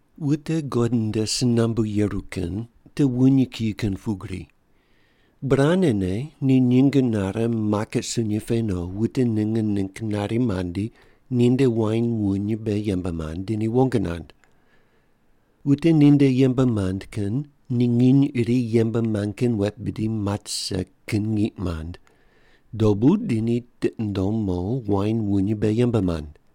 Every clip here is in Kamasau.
“Wute God nde si nambu yeru kin te wuny kiyi kin pugri. Burane ne ni nyinge nare maket sunyi pe no wute ninge ningg nari mandi ninde wain wuny mbe yembe mand di ni wong nand. Wute ninde yembe mand kin ni nginy iri yembe mand kin wet bidi mat rise kin ngiq mand, dobu di ni tiqi nundom mo wain wuny mbe yembe mand.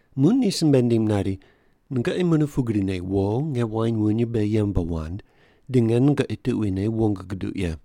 Muq ni simbe nindim nari, ‘Nungoqi mune pugrine wo nge wain wuny mbe yembe wand, di nge nungoqi tuquine wong guduq ye.’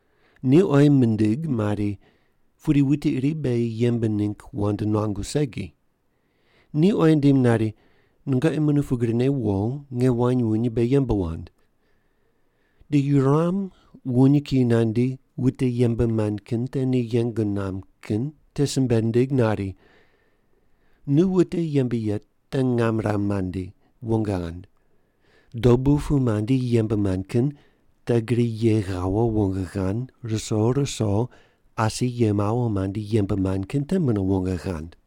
“Ni oyi mindig mari, ‘Pudi wuti iri beghi yembe ningg wand nuangu segi.’ Ni oyi nindim nari, ‘Nungoqi mune pugrine wo, nge wain wuny mbe yembe wand.’ Di yuram wuny kiyi nandi, wute yembe mand kin te ni yeng nuam kin te simbe nindig nari, ‘Nu wute yembe ye te ngam ram mandi, wong ghand. Dobu pu mandi yembe mand kin te gri ye ghawo wong ghand ruso ruso asi ye mawo mandi yembe mand kin te mune wong ghand.’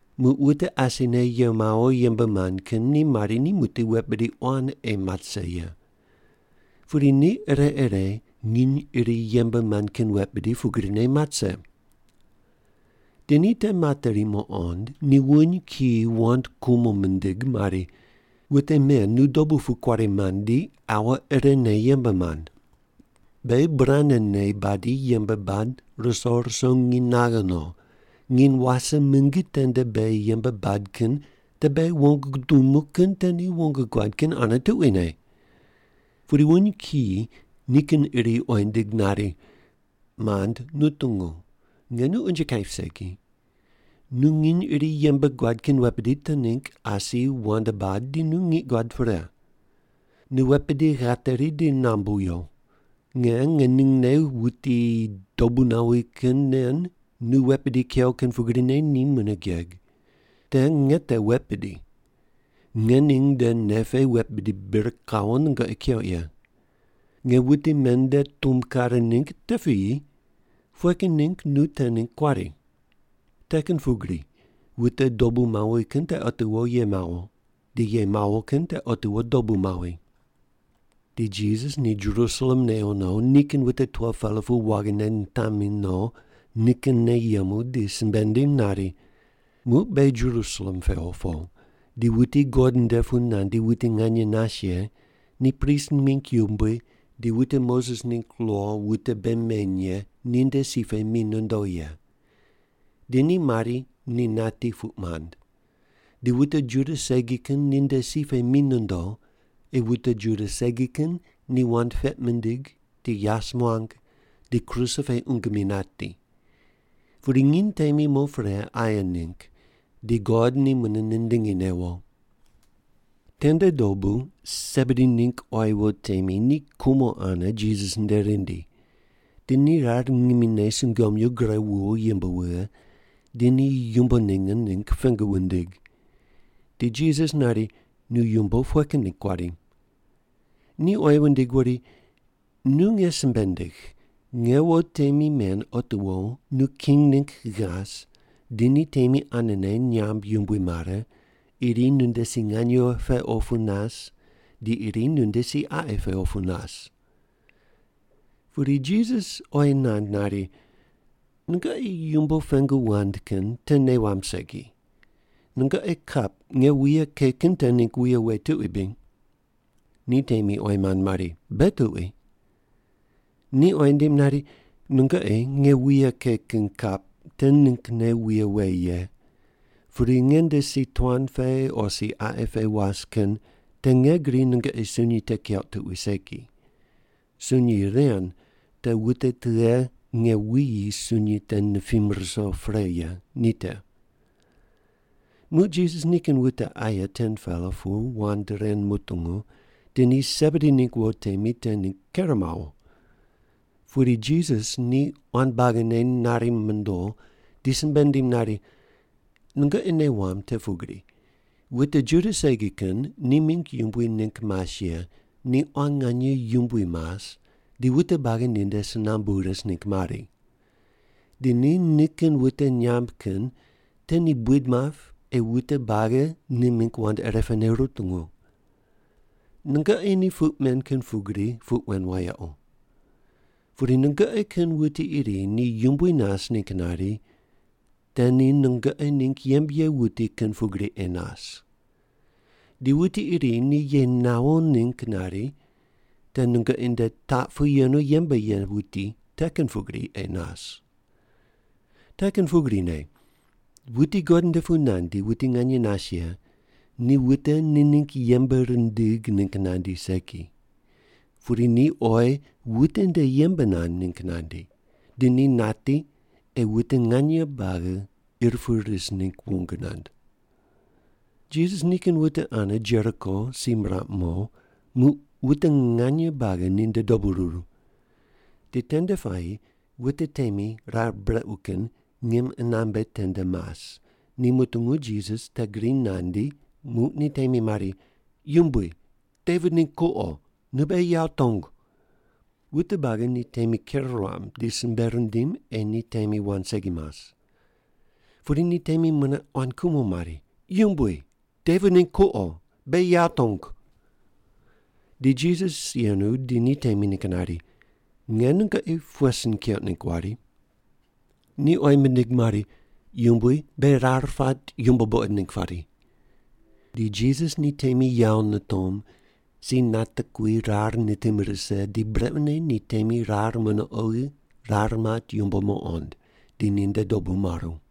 Muq wute asine ye mawo yembe mand kin ni mari ni muqdi wet bidi quan ei mat rise ye. Pudi ni ire ire nginy iri yembe mand kin wet bidi pugrine mat rise. Di ni te materi muqond, ni wuny kiyi wand kumo mindig mari, ‘Wute men nu dobu pu kuari mandi aua irene yembe mand. Beghi burane ne badi yembe bad ruso ruso nginy naghe no, nginy wase mingi tende beghi yembe bad kin te beghi wong gudumu kin te ni wong guad kin ane tuquine.’ “Pudi wuny kiyi ni kin iri oyi nindig nari, ‘Mand, nu tungu, nge nu unje kaip segi. Nu nginy iri yembe guad kin wet bidi te ningg asi wand bad di nu ngiq guad pre. Nu wet bidi ghateri di nambu yo. Nge ngeningne wuti dobu nawi kin nen nu wet bidi kew kin pugrine ni mune geg. Te nge te wet bidi. Ngening nde nei pe wet bidi bir kawo nungoqi keuq ye. Nge wute men nde tumb kare ningg te piyi, pughe kin ningg nu te ningg kuari’?” “Te kin pugrine wute dobu mawi kin te otiwo ye mawo, di ye mawo kin te otiwo dobu mawi.” Di Jisas ni Jerusalem newo no, nikin wute 12-pela pu waghine nitamine no nikinne yemu di simbe nindim nari, “Muq beghi Jerusalem pewo po, di wuti God nde pu nandi wuti nganye nas ye ni prist mingg yumbui di wute Moses ningg lo wute bei meny ye ninde si pe mi nondo ye. Di ni mari ni nati puq mand, di wute Juda segi kin ninde si pe mi nondo, ei wute Juda segi kin ni wand peq mindig, di yas muang, di kruse pe qungu mi nati. Pudi nginy temi mo pre aye ningg di God ni mune nindingi newo.” Tende dobu Sebedi ningg quayi wo temi ni kumo ane Jisas nde rindi. Di ni rar ngimine sungomyu gure wuwo yimb wughe, di ni yumbo ninge ningg pengu wundig. Di Jisas nari, “Nu yumbo pughe kin ningg kuari?” Ni oyi wundig wuri, “Nu nge simbe ndigh, nge wo temi men otiwo nu king ningg ghas di ni temi anene nyamb yumbui mare, iri nunde si nganye pe opu nas di iri nunde si qaqi pe opu nas.” Pudi Jisas oyi nand nari, “Nungoqi yumbo pengu wand kin te nei wamb segi. Nungoqi kap nge wuye ke kin te ningg wuye we tuqui bri?” Ni temi oyi mand mari, “Beghi tuqui.” Ni oyi nindim nari, “Nungoqi nge wuye ke kin kap te ninggne wuye we ye, pudi nge nde si tuan pe o si qaqi pe was kin te nge gri nungoqi sunyi te keuq tuqui segi. Sunyi ren te wute tughe nge wuyi sunyi te nipim ruso pre ye ni te.” Muq Jisas nikin wute aye 10-pela pu wand ren mutungu, di ni Sebedi ningg wo temi te ningg ker mawo. Pudi Jisas ni quan buagine nari mondo di simbe nindim nari, “Nungoqi nei wamb te pugri wute Juda segi kin ni mingg yumbui ningg mas ye ni quan nganye yumbui mas di wute buagi ninde si nambu ris ningg mari. Di ni nikin wute nyamb kin te ni buid map ei wute buagi ni mingg wand irepene rutungu. Nungoqi ni puq men kin pugri puq wen wayequ. Pudi nungoqi kin wuti iri ni yumbui nas ningg nari, te ni nungoqi ningg yembe ye wuti kin pugri ei nas. Di wuti iri ni ye nawo ningg nari, te nungoqi nde taq pu yenu yembe ye wuti te kin pugri ei nas. Te kin pugrine wuti God nde pu nandi wuti nganye nas ye ni wute ni ningg yembe rindig ningg nandi segi, pudi ni oyi wute nde yembe nand ningg nandi, di ni nati ei wute nganye buagi ir pu ris ningg wong nand.” Jisas nikin wute ane Jeriko si miraq mo, muq wute nganye buagi ninde dobu ruru. Di tende puayi wute temi rar brequ kin ngim qunambe tende mas, ni mutungu Jisas te gri nandi, muq ni temi mari, “Yumbui, Devit ningg kuqo, nu beghi yawo tongu.” Wute buagi ni temi ker ruam di simbe rindim ei ni temi wand segi mas. Pudi ni temi mune quan kumo mari, “Yumbui, Devit ningg kuqo, beghi yawo tongu.” Di Jisas yenu di ni temi ningg nari, “Nge nungoqi pughe sin keuq ningg wari?” Ni oyi mindig mari, “Yumbui, beghi rar pat yumbo buqod ningg pari.” Di Jisas ni temi yawo nitom si natekui rar nitim rise di brequne ni temi rar mune oghi rar mat yumbo muqond, di ninde dobu maru.